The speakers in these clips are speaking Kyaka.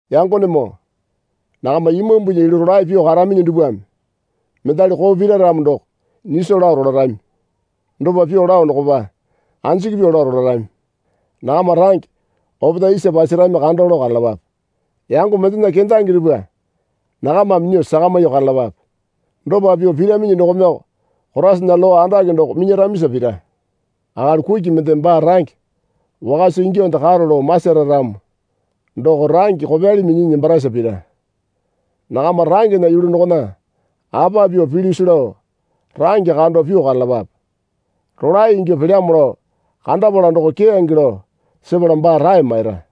Yangonemoo nakama Imambunya yulu rolae pyuo karaminyi dupwame mendali koo pira ramo doko nyiso lao rolarami. Dopa pyuo lao dokopa anjiki pyuo lao rolarami. Nakama range opetae isa pasarami kando lao karalapape. Yango mendena kendange dupwa nakamame nyuo sakamyuo karalapape. Dopa pyuo piraminyi dokomeko Koraisana lowa andake doko minyaramisa pira. Akali kuki mendeme baa range wakasa ingyuonde karo lao masara ramo doko range kopyali minyinyi nembarasa pira. Nakama rangena yulu dokona apa pyuo pilyusi lao range kando pyuo karalapape. Rolae ingyuo pelyamo lao kandapala doko keyange lao sepala baa rae maira.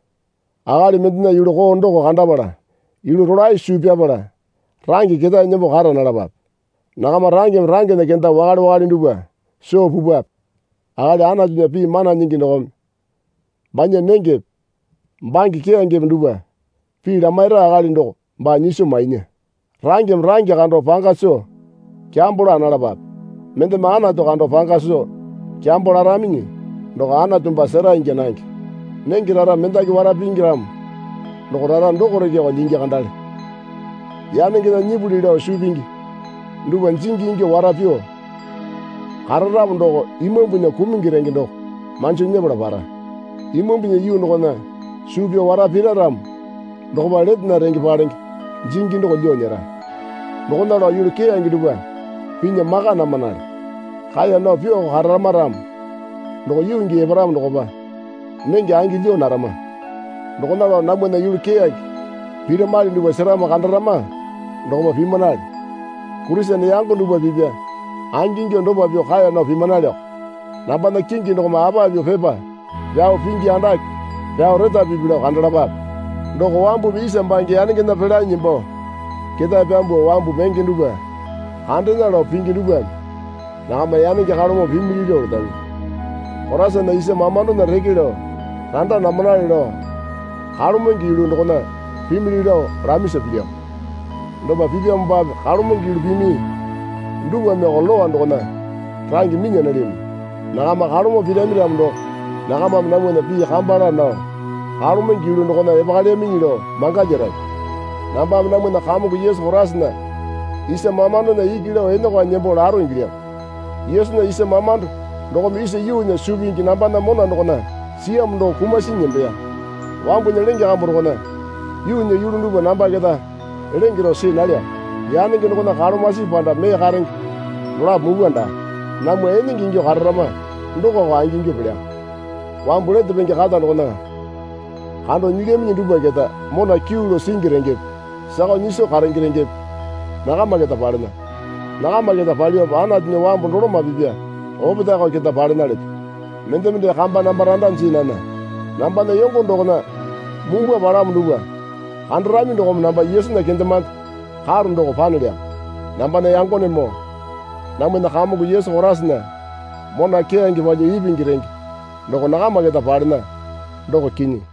Akali mendena yulu koo doko kandapala yulu rolae suu pyapala range ketae nembo kara nalapape. Nakama rangeme rangena kenda wakale wakale dupwa soo pupwape. Akali Anatunya pii mana nyingi dokome banya nengepe bange keyangepe dupwa pii lamaira akali doko baa nyiso mainya. Rangeme range kando panga soo kyambo laa nalapape. Mendeme Anatu kando panga soo kyambo laraminyi doko Anatu baa sera ingya nange. Nenge rara mendaki wara pingi ramo doko rara dokoreko lyingi kandale. Yanengena nyipuli lao suu pingi dupwa jingi ingyuo wara pyuo kararamo doko imambunya kumungi renge doko manjo nyepala para. Imambunya yuu dokona suu pyao wara pira ramo dokopa letena renge palenge jingi doko lyuo nyera. Dokona lao yulu keyange dupwa pinya maka namanale. Kaeya nao pyuoko kararama ramo doko yuu gii eparamo dokopa nenge angi lyuo narama. Dokona lao namwana yulu keyange piramali dupwa seramo kandarama dokopa pimanale. Kurisene yango dupwa pipya angingyuo dopa pyuo kaeya nao pimanaleko. Nambana kingi dokome apa pyuo pepa pyao pingi andake pyao retapipi lao kandalapape. Doko wambumi isa bange yanengena pelanyi nembo ketae pyambuo wambu menge dupwa kandena lao pingi dupwame nakama yanenge kalomo pimili lao letaminyi. Koraisana isa mamandona reke lao randa namanale lao kalomenge yulu dokona pimili lao lamisa pilyamo. Dopa pipyamopape kalomenge yulu pimi dupwameko Lowa dokona range minya nalyaminyi. Nakama kalomo pirami ramo doko nakamame namwana pii kamba laa nao kalomenge yulu dokona epakalyaminyi lao mangalyarami. Nambame namwana Kamongo Yesu Koraisana isa mamandona iki lao enokwanyi nembo laro ingilyamo. Yesunya isa mamando dokome isa yuunya suu pingi nambana mona dokona siyamo doko kumasinyi nembeya. Wambunya lenge kambu dokona yuunya yulu dupwa namba keta lenge rao see nalyamo. Yanenge dokona kalomasipi panda mee karenge dolapo mupwa daa. Namwa enenge ingyuo kararama dokoko angingyuo pelyamo. Wambu lete penge kata dokona kando nyilyaminyi dupwa keta mona kyuu lao singi rengepe sakao nyiso karenge rengepe nakama keta palena. Nakama keta palyuope Anatunya wambu doloma pipya opetaeko keta palena leto. Mendeme dee kamba namba randa jii nana. Nambana yongo dokona mumbwa palamo dupwa kandarami dokome namba Yesunya kendemande karo doko panelyamo. Nambana yangonemoo namwana Kamongo Yesu Koraisana mona keyange palyuo ipingi renge doko nakama keta palena, doko kinyi.